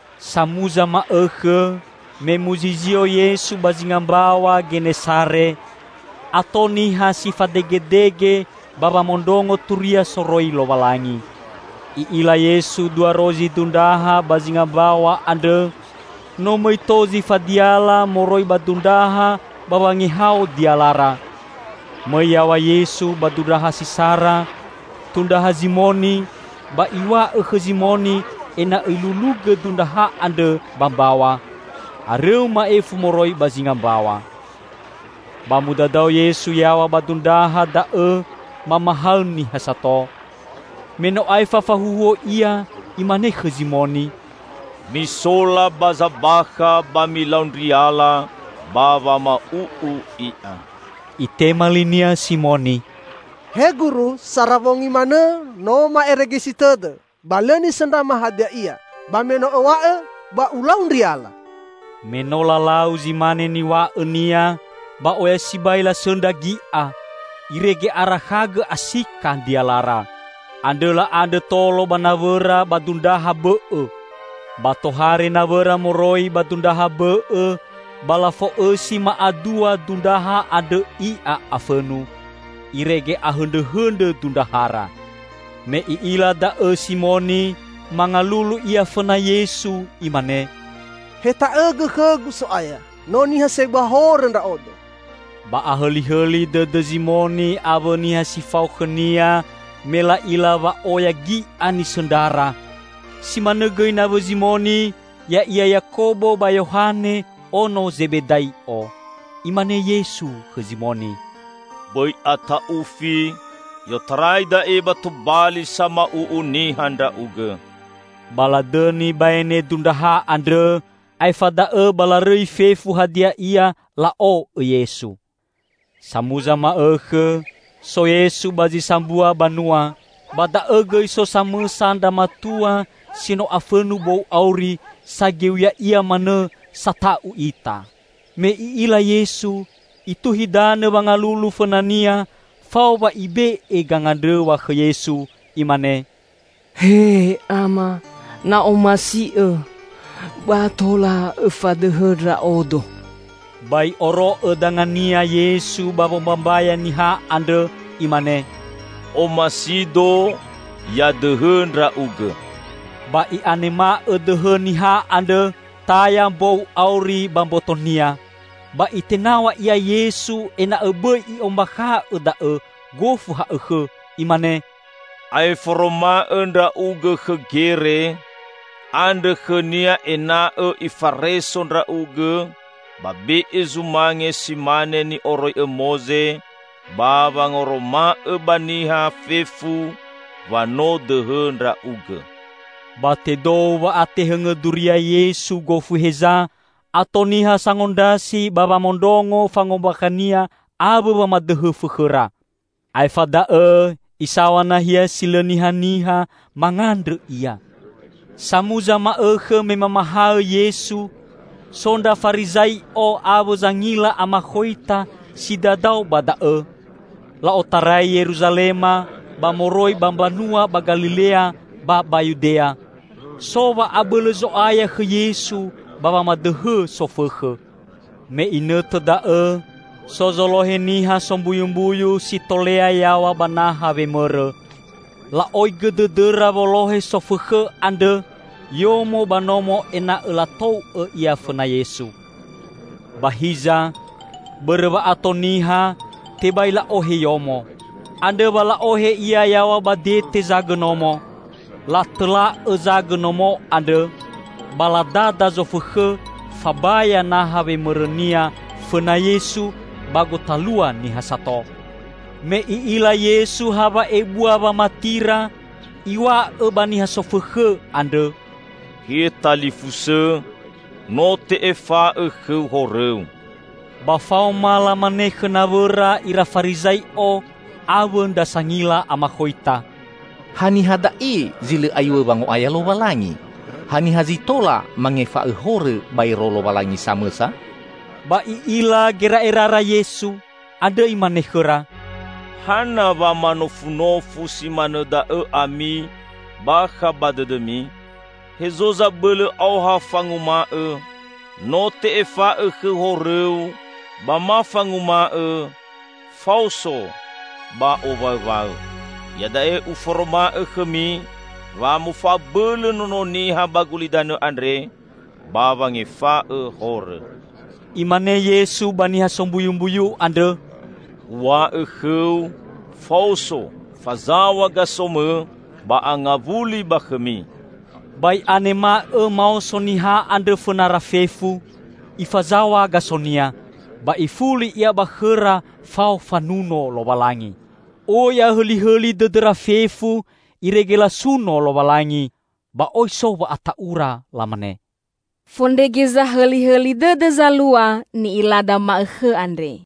Samuza ma'õkhõ, me muzizio Yesu ba zinga mbaw̃a Genesare, ato niha si fadegedege ba wamondrongo turia soroi Lowalangi. I'ila Yesu dua rozi dundraha ba zinga mbaw̃a andrõ; no mõi tou zi fadiala moroi ba dundraha ba wangehao dialara. Mõi yaw̃a Yesu ba dundraha si sara, tundraha Zimoni, ba Iw̃a'õ khõ Zimoni ena'õ ilulugõ dundraha andrõ ba mbaw̃a, arõu ma'ifu moroi ba zinga mbaw̃a. Ba mudadao Yesu yaw̃a ba dundraha da'õ mamahaõ niha sato. Me no aefa fahuhuo Ia, Imane khõ Zimoni, "Misola ba zabakha ba milau ndriala ba wama'u'u i'a." Itema li-Nia Simoni, "He Guru, sara wongi manõ no ma'eregesi tõdõ, ba lõ nisõndrama hadia ia! Ba me no Õw̃a'õ, ba ulau ndriala." Me no lalau zi mane niw̃a'õ-Nia, ba oya sibai lasõndra gi'a, irege arakhagõ asika ndrialara. Andrõ la'andrõ tolo ba nawõra ba dundraha bõ'õ. Ba tohare nawõra moroi ba dundraha bõ'õ, ba lafo'õsi ma'adua dundraha andrõ i'a afõnu, irege ahõndrõhõndrõ dundrahara. Me i'ila da'õ Simoni, mangalulu ia fõna Yesu, imane, "Heta'õgõ khõgu, So'aya! No niha sebua horõ ndra'odo!" Ba ahõlihõli dõdõ Zimoni awõ niha si fao khõnia me la'ila wa'oya gi'a nisõndrara. Si manõ gõi nawõ Zimoni, ya'ia Yakobo ba Yohane, ono Zebedai'o. Imane Yesu khõ Zimoni, "Bõi ata'ufi! I'otarai da'e ba tobali sama'u'u niha ndra'ugõ." Ba ladõni baene dundraha andrõ, aefa da'õ ba larõi fefu hadia ia, la'o'õ Yesu. Samuza ma'õkhõ, so Yesu ba zi sambua banua. Ba da'õ gõi so samõsa ndra matua si no afõnu bou auri, sageu ya'ia manõ, sata'u ita. Me i'ila Yesu, ituhi danõ wangalulu fõna-Nia fao wa ibe'e gangandrõw̃a khõ Yesu, Imane, "He Ama, na'omasi'Õ ba tola Õfadõhõ ndra'odo!" Ba I'oro'õ danga-Nia Yesu ba wombambaya niha andrõ Imane, "Omasi-Do ya dõhõ ndra'ugõ!" Ba'i'a nema'õ dõhõ niha andrõ, taya mbou auri ba mbotonia. Ba Itenaw̃a ia Yesu ena'õ bõi i'ombakha'õ da'õ gofu ha'õkhõ, Imane, "Ae foroma'õ ndra'ugõ khõ gere, andrõ khõnia ena'õ ifareso ndra'ugõ, ba be'e zumange si mane ni'oroi'õ Moze, ba wangoroma'õ ba niha fefu wa no dõhõ ndra'ugõ." Ba tedou wa'atehõngõ duria Yesu gofu heza, ato niha sangondrasi ba wamondrongo fangombakha-Nia awõ wamadõhõ fõkhõra. Aefa da'õ Isaw̃a nahia si lõ nihaniha, mangandrõ Ia. Samuza ma'õkhõ me mamahaõ Yesu, so ndra Farizai'o awõ zangila amakhoita si dadao ba da'õ. La'otarai Yeruzalema, ba moroi ba mbanua ba Galilea ba ba Yudea. So wa'abõlõ Zo'aya khõ Yesu ba wamadõhõ sofõkhõ. Me inõtõ da'õ so zolohe niha sombuyumbuyu si tolea yaw̃a ba naha wemõrõ. La'oigõ dõdõra wolohe sofõkhõ andrõ yomo ba nomo ena'õ latou'õ ia fõna Yesu. Ba hiza, bõrõ wa'ato niha, tebai la'ohe yomo. Andrõ wa la'ohe ia yaw̃a ba dete zagõ nomo. Latõla'õ zagõ nomo andrõ, ba ladada zofõkhõ fabaya naha wemõrõnia fõna Yesu ba gotalua niha sato. Me I'ila Yesu hawa'ebua wamatira, Iw̃a'õ ba niha sofõkhõ andrõ, "He talifusõ, no te'efa'õ khõu horõu." Ba faoma lamane khõ nawõra ira Farizai'o awõ ndra sangila amakhoita, "Haniha da'e zi lõ aiw̃õ wango'aya Lowalangi? Haniha zi tola mangefa'õ horõ baero Lowalangi samõsa?" Ba I'ila gera'erara Yesu. Andrõ Imane khõra, "Hana wa manofunofu si manõ da'õ ami bakha ba dõdõmi? Hezo zabõlõ aoha fanguma'õ, 'No te'efa'õ khõu horõu,' ba ma fanguma'õ, 'Faoso ba owaõwaõ!' Iada'e Uforoma'õ khõmi wa mofa'abõlõ Nono Niha ba gulidanõ andre ba wangefa'õ horõ." Imane Yesu ba niha sombuyumbuyu andrõ, "Uw̃a'õ khõu; Faoso, fazaw̃a gasomõ, ba angawuli ba khõmi!" Ba i'anema'õ maoso niha andrõ fõnara fefu, ifazaw̃a gasonia, ba ifuli ia ba khõra fao fanuno Lowalangi. Oi ahõlihõli dõdõra fefu, irege lasuno Lowalangi. Ba oi so wa'ata'ura, lamane, "Fondrege zahõlihõli dõdõ zalua ni'ilada ma'õkhõ andre!"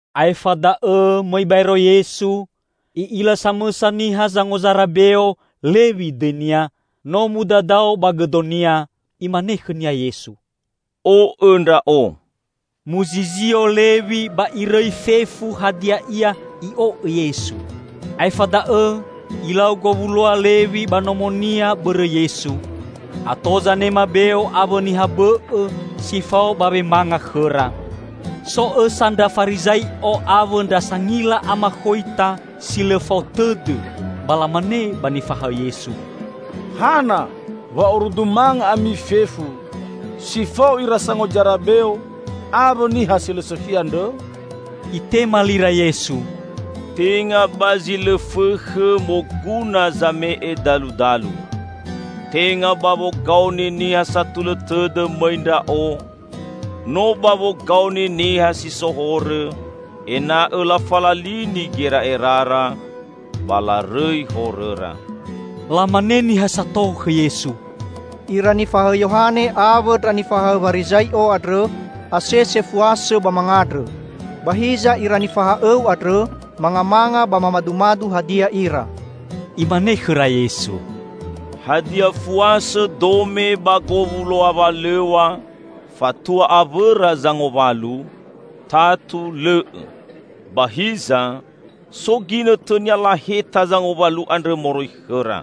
Aefa da'õ mõi baero Yesu, I'ila samõsa niha sangozara beo, Lewi dõinia, no mudadao ba gõdonia. Imane khõnia Yesu, "O'õ Ndra'o." Muzizio Lewi ba irõi fefu hadia ia, i'o'õ Yesu. Aefa da'õ ilau gowuloa Lewi ba nomonia bõrõ Yesu. Ato zanema beo awõ niha bõ'õ si fao ba wemanga khõra. So õsa ndra Farizai'o awõ ndra sangila amakhoita si lõ fao tõdõ, ba lamane ba nifahaõ Yesu, "Hana wa orudu manga ami fefu si fao ira sangozara beo awõ niha si lõ sõkhi andrõ?" Itema lira Yesu, "Tenga ba zi lõ fõkhõ moguna zame'e daludalu. Tenga ba wogaoni niha satulõ tõdõ mõi Ndra'o, no ba wogaoni niha si so horõ, ena'õ lafalalini gera'erara ba larõi horõra." Lamane niha sato khõ Yesu, "Ira nifahaõ Yohane awõ ndra nifahaõ Warizai'o andrõ asese fuasõ ba mangandrõ. Ba hiza, ira nifaha'õ-U andrõ mangamanga ba mamadumadu hadia ira." Imane khõra Yesu, "Hadia fuasõ dome ba gowuloa walõw̃a, fatua awõra zangowalu? Tatu lõ'õ! Ba hiza, so ginõtõnia laheta zangowalu andrõ moroi khõra.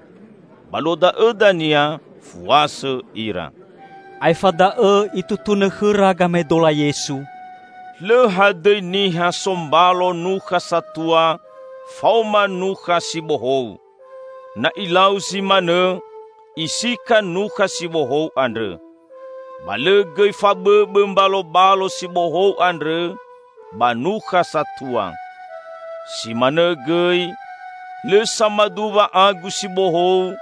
Ba luo da'õ dania fuasõ ira." Aefa da'õ Itutunõ khõra gamaedola Yesu, "Lõ hadõi niha so mbalo nukha satua faoma nukha si bohou. Na ilau zi manõ, isika nukha si bohou andrõ. Ba lõ gõi fabõbõ mbalobalo si bohou andrõ ba nukha satua. Si manõ gõi, lõ samaduwa agu si bohou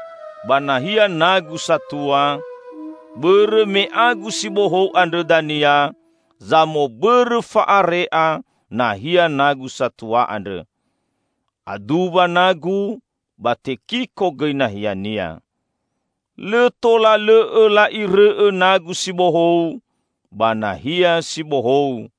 ba nahia nagu satua, bõrõ me agu si bohou andrõ dania zamobõrõ fa'are'a nahia nagu satua andrõ. Aduwa nagu, ba tekiko gõi nahiania. Lõ tola lõ'õ la'irõ'õ nagu si bohou ba nahia si bohou!